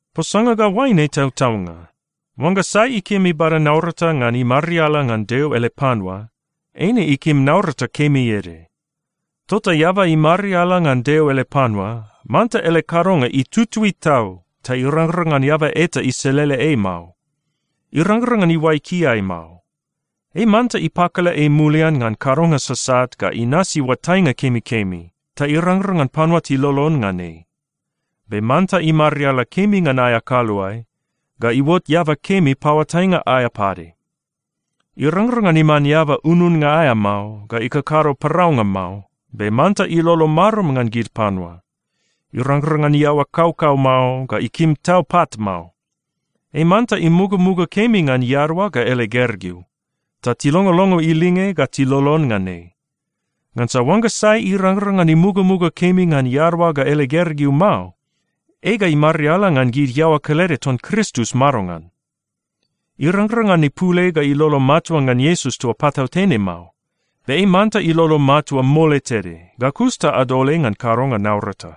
Posanga ga oaine tautaunga. Oangga sai ikim ibada naurata ngan imariala ngan Deo ele panua, eine ikim naurata kemi ede. Tota eaba imariala ngan Deo ele panua, manta ele kadonga itutui tau, ta irangrang ngan eaba eta iselele ei mao. Irangrang ngan iuai kiai mao. Ei manta ipakala ei mulian ngan kadonga sasat ga inasi oatainga kemikemi, ta irangrang ngan panua tilolon ngan ei. Be manta imariala kemi ngan aea kaluae, ga iuot eaba kemi paoatainga aea pade. Irangrang ngan iman eaba ununnga aea mao, ga ikakado paraunga mao, be manta ilolo marum ngan gid panua. Irangrang ngan iaoa kaukau mao, ga ikim tau pat mao. Ei manta imugamuga kemi ngan iadaoa ga ele gergeu, ta tilongolongo ilinge ga tilolon ngan ei. Ngansa oangga sai irangrang ngan imugamuga kemi ngan iadaoa ga ele gergeu mao, ei ga imariala ngan gid iaoa kelede ton Kristus madongan? Irangrang ngan ipul ei ga ilolo matua ngan Iesus toa patautene mao, be ei manta ilolo matua mole tede, ga kus ta adol ei ngan kadonga naurata.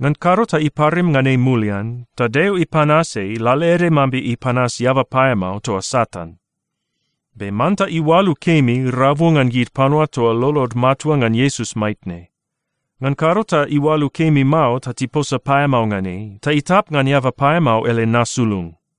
Ngan kado ta iparim ngan ei mulian, ta Deo ipanas ei lalaede mambe ipanas eaba paeamao toa Satan. Be manta iualu kemi rabu ngan gid panua toa lolod matua ngan Iesus maitne. Ngan kado ta iualu kemi mao, ta tiposa paeamao ngan ei, ta itap ngan eaba paeamao ele nasulung.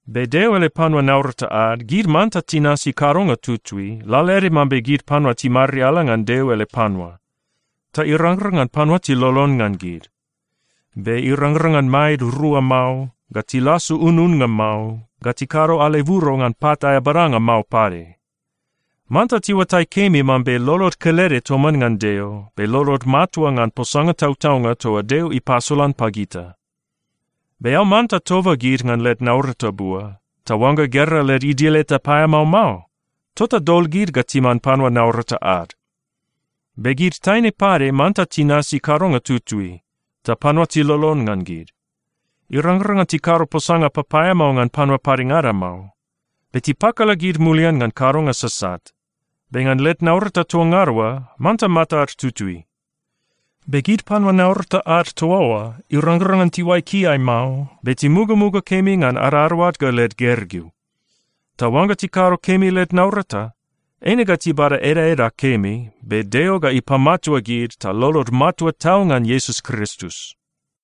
Be Deo ele panua naurata ad, gid manta tinasi kadonga tutui, lalaede mambe gid panua timariala ngan Deo ele panua, ta irangrang ngan panua tilolon ngan gid. Be irangrang ngan maed rua mao, ga tilasu ununnga mao, ga tikado aleburo ngan pat aea badanga mao pade. Manta tiuatai kemi mambe lolod kelede toman ngan Deo, be lolod matua ngan posanga tautaunga toa Deo ipasolan pagita. Be eao manta toba gid ngan led naurata bua. Ta oangga gera led idil eta paeamao mao, tota dol gid ga timan panua naurata ad. Be gid taine pade manta tinasi kadonga tutui, ta panua tilolon ngan gid. Irangrang ngan tikado posanga papaeamao ngan panua padengada mao. Be tipakala gid mulian ngan kadonga sasat. Be ngan led naurata toa ngada oa, manta matad tutui. Be gid panua naurata ad toa oa, irangrang ngan tiuai kiai mao, be timugamuga kemi ngan adadaoad ga led gergeu. Ta oangga tikado kemi led naurata, eine ga tibada edaeda kemi. Be Deo ga ipamatua gid ta lolod matua tau ngan Iesus Kristus.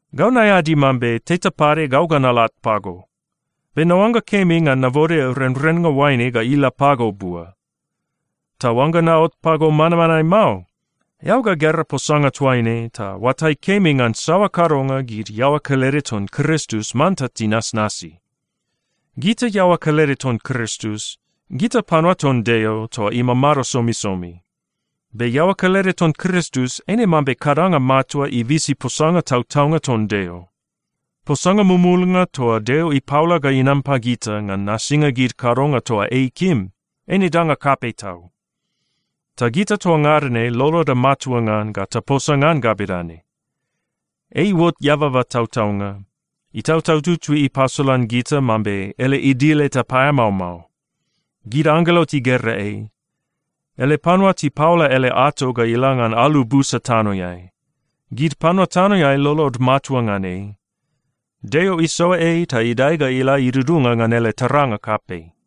Gau naeadi mambe teta pade gau ga nalat pago. Be naoangga kemi ngan nabode renrennga oaine ga ila pago bua. Ta oangga naot pago manmanae mao, eao ga gera posanga toaine ta oatai kemi ngan saoa kadonga gid iaoa kelede ton Kristus manta tinasnasi. Gita iaoa kelede ton Kristus, gita panua ton Deo toa imamado somisomi. Be iaoa kelede ton Kristus eine mambe kadanga matua ibisi posanga tautaunga ton Deo. Posanga mumulnga toa Deo ipaola ga inam pagita ngan nasinga gid kadonga toa ei ikim, eine danga kapei tau. Ta gita toa ngada ne loloda matua ngan ga taposa ngan ga bedane: Ei iuot eababa tautaunga. Itautau Tutui ipasolan gita mambe ele idil eta paeamao mao. Gid anggelo tigera ei. Ele panua tipaola ele ato ga ila ngan alu busa tanoeai. Gid panua tanoeai lolod matua ngan ei. Deo isoa ei ta idae ga ila idudunga ngan ele taranga kapei.